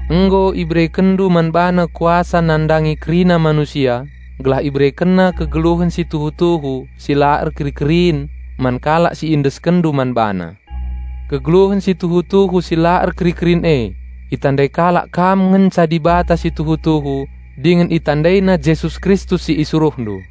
Nggo IberekenNdu man BaNa kuasa nandangi kerina manusia, gelah IberekenNa kegeluhen si tuhu-tuhu si la erkeri-kerin man kalak si IendeskenNdu man BaNa. Kegeluhen si tuhu-tuhu si la erkeri-kerin e: Itandai kalak Kam ngenca Dibata si tuhu-tuhu, dingen itandaina Jesus Kristus si IsuruhNdu.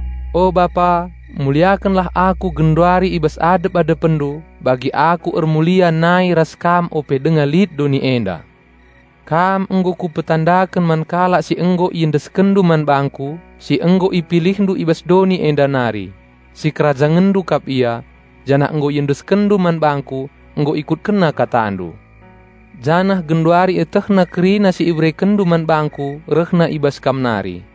O Bapa, muliakenlah Aku genduari i bas adep-AdepenNdu bagi Aku ermulia nai ras Kam ope denga lit doni enda. Kam nggo Kupetandaken man kalak si nggo IendeskenNdu man bangKu, si nggo IpilihNdu i bas doni enda nari. SikerajangenNdu kap ia, janah nggo IendeskenNdu man bangKu. Nggo ikutkenna KataNdu, janah genduari ietehna kerina si IberekenNdu man bangKu rehna i bas Kam nari.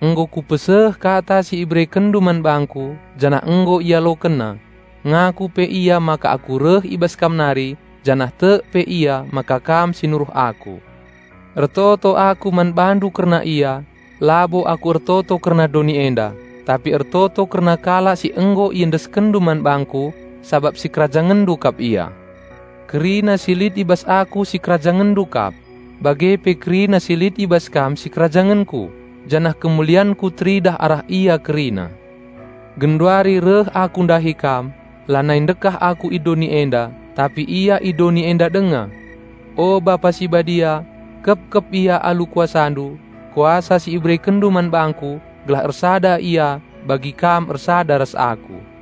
Nggo Kupeseh Kata si IberekenNdu man bangKu, janah nggo ialokenna. Ngaku pe ia maka Aku reh i bas Kam nari janah tek pe ia maka Kam si nuruh Aku. Ertoto Aku man BaNdu kerna ia. Labo Aku ertoto kerna doni enda, tapi ertoto kerna kalak si nggo IendeskenNdu man bangKu, sabap SikerajangenNdu kap ia. Kerina si lit i bas Aku SikerajangenNdu kap, bage pe kerina si lit i bas Kam sikerajangenKu; janah kemulianKu teridah arah ia kerina. Genduari reh Aku ndahi Kam; lanai ndekah Aku i doni enda, tapi ia i doni enda denga. O Bapa si Badia, kepkep ia alu KuasaNdu, Kuasa si IberekenNdu man bangKu, gelah ersada ia bagi Kam ersada ras Aku.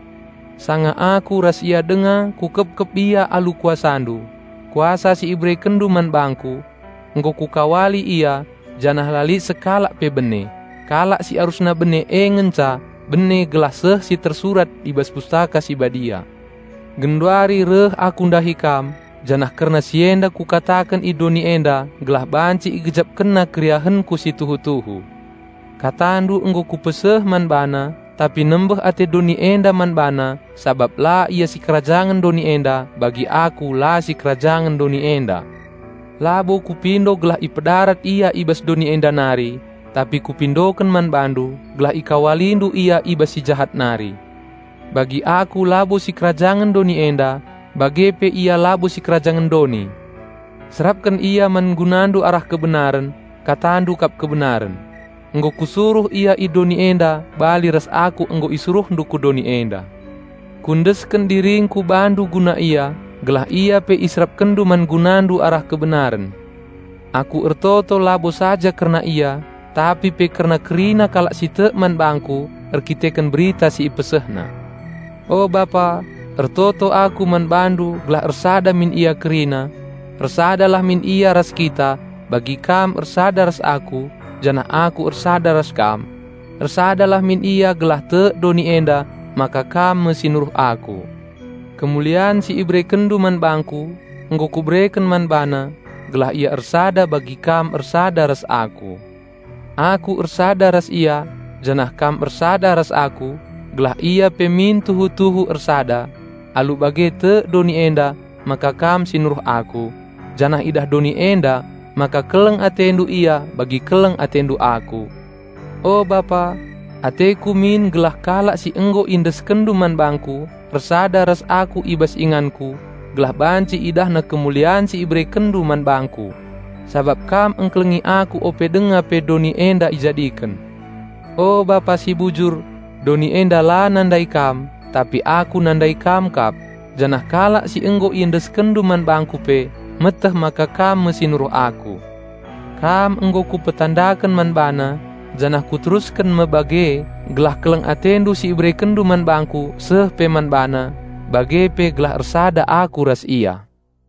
Sanga Aku ras ia denga Kukepkep ia alu KuasaNdu, Kuasa si IberekenNdu man bangKu. Nggo Kukawali ia, janah la lit sekalak pe bene; kalak si arusna bene e nge ngenca bene gelah seh si tersurat i bas Pustaka Si Badia. Genduari reh Aku ndahi Kam, janah kerna si enda Kukataken i doni enda gelah banci igejapkenna keriahenKu si tuhu-tuhu. KataNdu nggo Kupeseh man bana, tapi nembeh ate doni enda man bana sabap la ia sikerajangen doni enda bagi Aku la sikerajangen doni enda. Labo Kupindo gelah ipedarat ia i bas doni enda nari, tapi Kupindoken man BaNdu gelah IkawaliNdu ia i bas si jahat nari. Bagi Aku labo sikerajangen doni enda, bage pe ia labo sikerajangen doni. Serapken ia man GunaNdu arah kebenaren; KataNdu kap kebenaren. Nggo Kusuruh ia ku doni enda bali ras Aku nggo IsuruhNdu ku doni enda. Kuendesken diringKu Bandu guna ia, gelah ia pe IserapkenNdu man GunaNdu arah kebenaren. Aku ertoto labo saja kerna ia, tapi pe kerna kerina kalak si tek man bangKu erdandanken berita si ipesehna. O Bapa, ertoto Aku man BaNdu gelah ersada min ia kerina. Ersadalah min ia ras Kita, bagi Kam ersada ras Aku janah Aku ersada ras Kam. Ersadalah min ia gelah tek doni enda maka Kam me si nuruh Aku. Kemulian si IberekenNdu man bangKu, nggo Kubereken man bana, gelah ia ersada bagi Kam ersada ras Aku. Aku ersada ras ia, janah Kam ersada ras Aku, gelah ia pe min tuhu-tuhu ersada. Alu bage tek doni enda maka Kam si Nuruh Aku, janah idah doni enda maka keleng AteNdu ia bagi keleng AteNdu Aku. O Bapa, ateKu min gelah kalak si nggo IendeskenNdu man bangKu, ersada ras Aku i bas inganKu, gelah banci idahna kemulian si IberekenNdu man bangKu; sabap kam engkelengi Aku ope denga pe doni enda ijadiken. O Bapa si bujur, doni enda la nandai Kam, tapi Aku nandai Kam kap, janah kalak si nggo IendeskenNdu man bangKu pe meteh maka Kam me si nuruh Aku. Kam nggo Kupetandaken man bana janah Kuterusken me bage gelah keleng AteNdu si IberekenNdu man bangKu seh pe man bana, bage pe gelah ersada Aku ras ia."